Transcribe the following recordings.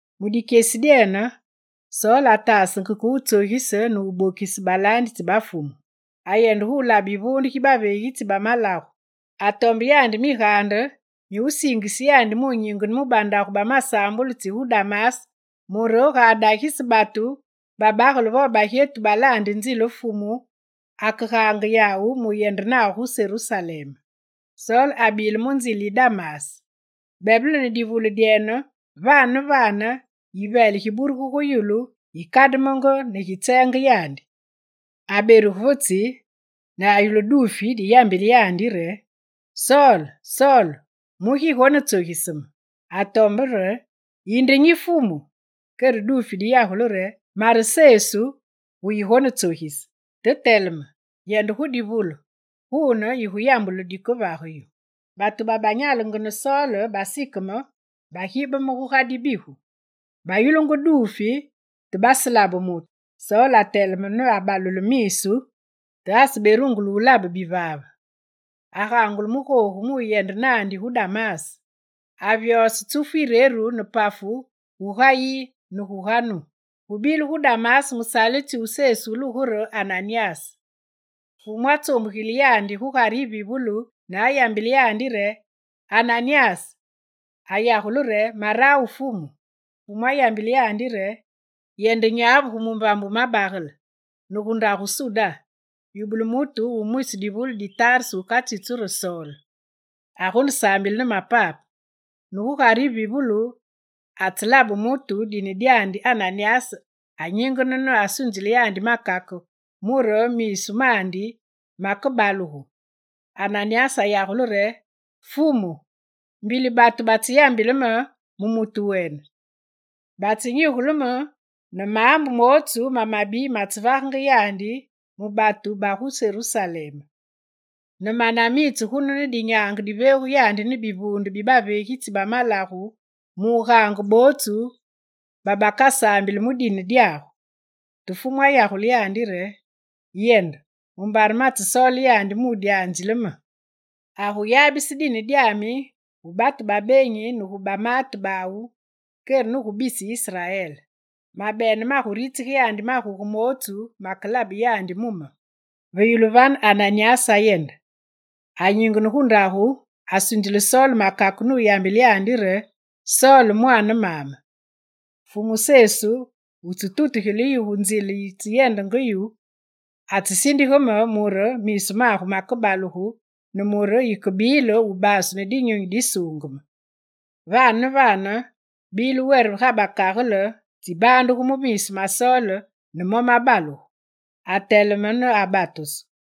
Mu dikyesi dyene, Sol ataasenge ke wutsogise ne wubokise balaanditsi ba Fumu. Ayende gulabe yivuunde gi baveegitsi ba malagu. Atombe yandi migaande mi wusiingise yandi munyingene mu bandagu ba masaambulu tsi gu Damas, mure ga adagise batu, babagele vo bagyetu, balaande nzile Fumu, akegaange yawu muyende nawu gu Serusalem. Sol abile mu nzile yi Damas. Bebele ne divule dyene, vane ne vane, yiveele giburugu gu yulu gikademenge, ne gitseenge yandi. Aberuge ve tsi, ne ayulu duufi diyambile yandi re: «Sol, Sol, mugi yigonetsogise me?» Atombe re: «Yinde nyi Fumu?» Kere duufi diyagule re: «Mare Sesu, wu yigonetsogise. Te teleme, yende gu divule, gune yiguyambulu dikevage yu.» Batu babanyale ne Sol basikeme, bagibeme guga dibigu; bayulungu duufi, te baselabe mutu. Sol ateleme ne abalule misu, te aseberungule wulabe bivaave. Agaangulu mu googu muyende naandi gu Damas. Avyose tsufu yireru ne pafu guga yi guga nu. Gubile gu Damas mulaanditsi wu Sesu wulugu re Ananyas. Fumu atsoombugile yandi gu Gugare yivivulu ne ayambile yandi re: «Ananyas!» Ayagule re: «Marawu Fumu.» Fumu ayambile yandi re: «Yende nyavu gu mumbambe Wumabagele, ne gu ndagu Suda, yubule mutu wu mwisi divule di Tarse wukatsitsu re Sol. Agonesaambile ne mapape, ne gu Gugare yivivulu, atselabe mutu dine dyandi Ananyas anyingene ne asunzile yandi makake mure miisu mandi makebalugu.» Ananyas ayagule re: «Fumu, mbili batu batseyambile me mu mutu wene, batsenyigule me ne maambu mootsu mamabi matsevagenge yandi mu batu ba gu Serusalem. Ne mane amitse gunu ne dinyaange diveegu yandi ne bivuunde bi baveegitsi bamalagu mu wugaange bootsu babakasaambili mu dine dyagu.» Te Fumu ayagule yandi re: «Yende, mumbare matsesoole yandi mu dyanzile me: Aguyabise dine dyami gu batu ba beenyi ne gu bamaate bawu, kere ne gu bisi Israel. Mabene maguritsige yandi maguge mootsu makelabe yandi mu me.» Ve yulu vane Ananyas ayende. Anyingene gu ndagu, asunzile Sol makake nuyambile yandi re: «Sol, mwaane maame, Fumu Sesu wutsetutugile yu mu nzile yitsyendenge yu, atsesindige me mure miisu magu makebalugu ne mure yikebile wubaasu ne Dinyunyi Disuungeme.» Vane ne vane, bile were ga bakagele tsibaandugenge gu miisu ma Sol ne mo mabalugu. Ateleme ne abatusu,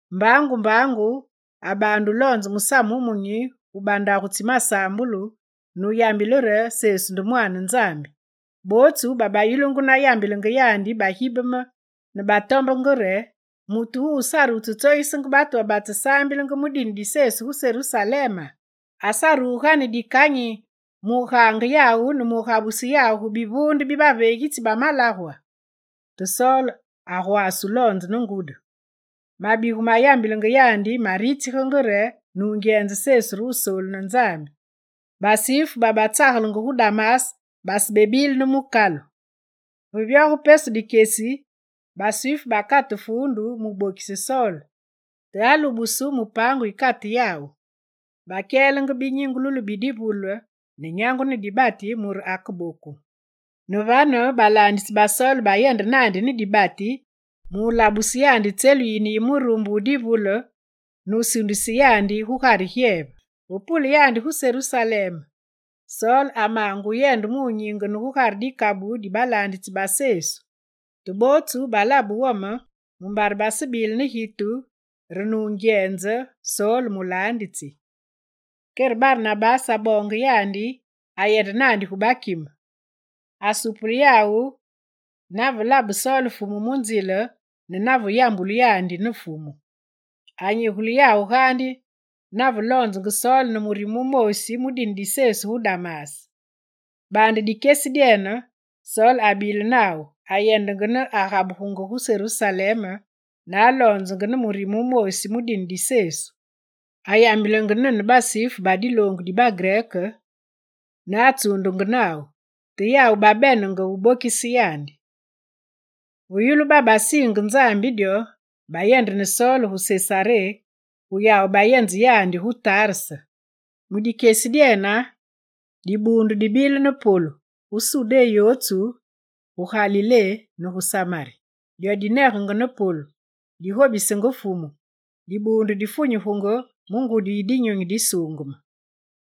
Mbaangu mbaangu abaande wuloonze musamu wumunyi gu bandagu tsi masaambulu, nuyambile re Sesu nde Mwaane Nzambi. Bootsu babayulungu na yambilenge yandi bagibeme ne batombenge re: «Mutu wuwu sare wutsetsogisenge batu babatsesaambilenge mu dine di Sesu gu Serusalema? Asaruge ga ne dikanyi mugaange yawu ne mu gabuse yawu gu bivuunde bibaveegitsi ba malagwa?» Te Sol agwaase wuloonze ne ngudi. Mabigu mayambilenge yandi maritsigenge re nungyenze Sesu re Wusoolu ne Nzambi. Basifu babatsagelenge gu Damas basebedile mukalu. Ve vyoge pesu dikyesi, basifu bakate fuundu mubokise Sol, te alubusu mu paangu yikate yawu. Bakyelenge binyingululu bi divule ne nyangu ne dibati, mure akeboku. Ne vane balaanditsi ba Sol bayende naandi ne dibati mulabuse yandi tselu yine yi murumbe wu divule nusuundise yandi gugare gyeve. Ve pule yandi gu Serusalem, Sol amaange wuyende gu nyingene gugare dikabu di balaanditsi ba Sesu; te bootsu balabe wome, mumbare basebile ne gitu re nungyenze Sol mulaanditsi. Kere Barnabase aboonge yandi, ayende naandi gu bakime. Asupule yawu nave labe Sol Fumu mu nzile ne nave yambulu yandi ne Fumu. Anyigule yawu keke nave loonzenge Sol ne murime wumoosi mu dine di Sesu gu Damas. Baande dikyesi dyene, Sol abile nawu, ayendenge ne agabugenge gu Serusalem, ne aloonzenge ne murime wumoosi mu dine di Sesu. Ayambilenge nene basifu ba diloongu di bagrek ne atsuundenge nawu, te yawu babenenge wubokise yandi. Ve yulu babasiinge Nzambi dyo, bayende ne Sol gu Sesaré, gu yawu bayenze yandi gu Tarse. Mu dikyesi dyene, dibuundu dibile ne polu gu Sudé yootsu, gu Galilé ne gu Samari. Dyo dinegenge ne polu, digobisenge Fumu, dibuundu difunyugenge mu ngudi yi Dinyunyi Disuungeme.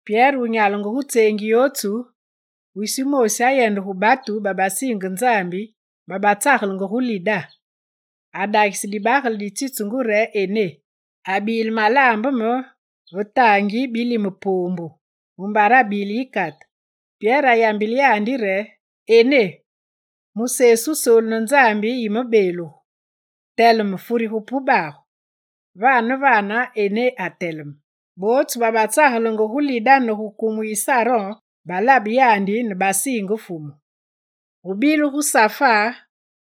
Pyere wunyalenge gu tseengi yootsu, wisi wumoosi ayende gu batu babasiinge Nzambi babatsagelenge gu Lida. Adagise dibagele ditsitsungu re Ené, abile malaambeme ve taangi bilime poombu mumbare abile yikate. Pyere ayambile yandi re: «Ené, mu Sesu Wusoolu ne Nzambi, yimebeelugu! Teleme furige pubagu.» Vane ne vane Ené ateleme. Bootsu babatsagelenge gu Lida ne gu kumu yi Saron balabe yandi ne basiinge Fumu. Gubile gu Safa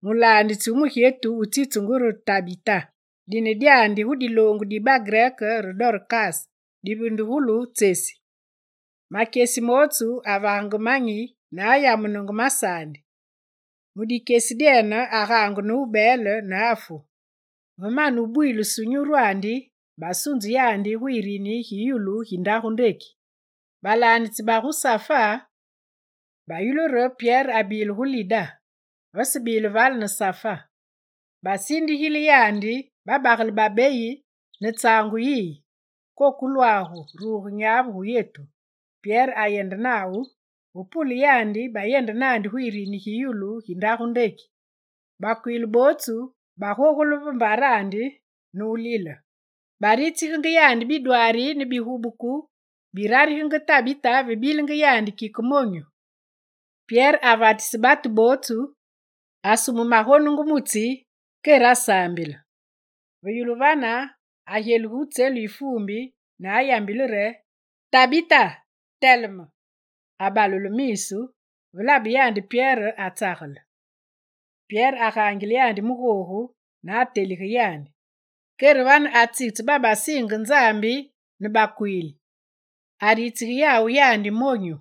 mulaanditsi wu mugyetu wutsitsungu re Tabita. Dine dyene gu diloongu di bagrek re Dorkas divindugulu re tsesi. Makyesi mootsu avagenge manyi ne ayamunenge masaandi. Mu dikyesi dyene, agaangu ne wubeele, ne afu. Ve mane wubwilusu nyurwandi, basunze yo gu yirini gi yulu, gi ndagu. Balaanditsi bagu Safa bayulu re Pyere abile gu Lida, vasebile vale ne Safa. Basindigile yandi babagele babeyi ne tsaangu yiyi: «Kokolwagu, ruge nyavu gu yetu.» Pyere ayende nawu. Ve pule yandi, bayende naandi gu yirini gi yulu gi ndagu. Bakwiili bootsu bagogule va mbarandi ne wulile; baritsigenge yandi bidwaari ne bigubuku birarigenge Tabita ve bilenge yandi kike monyu. Pyere avatise batu bootsu, asume magonungu mutsi kere asaambile. Ve yulu vane, agyeluge gu tselu yi fuumbi ne ayambile re: «Tabita, teleme!» Abalule miisu, ve labe yandi Pyere, atsagele. Pyere agaangile yandi mu googu ne atelige yandi. Kere vane atsitse babasiinge Nzambi ne bakwiili, aritsige yawu yandi, monyu.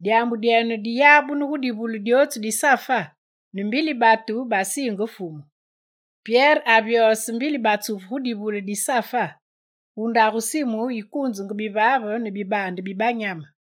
Dyaambu dyene diyabunu gu divule dyootsu di Safa, ne mbili batu basiinge Fumu. Pyere avyose mbili batsufu gu divule di Safa gu ndagu Simu wukuunzenge bivaave ne bibaande bi banyame.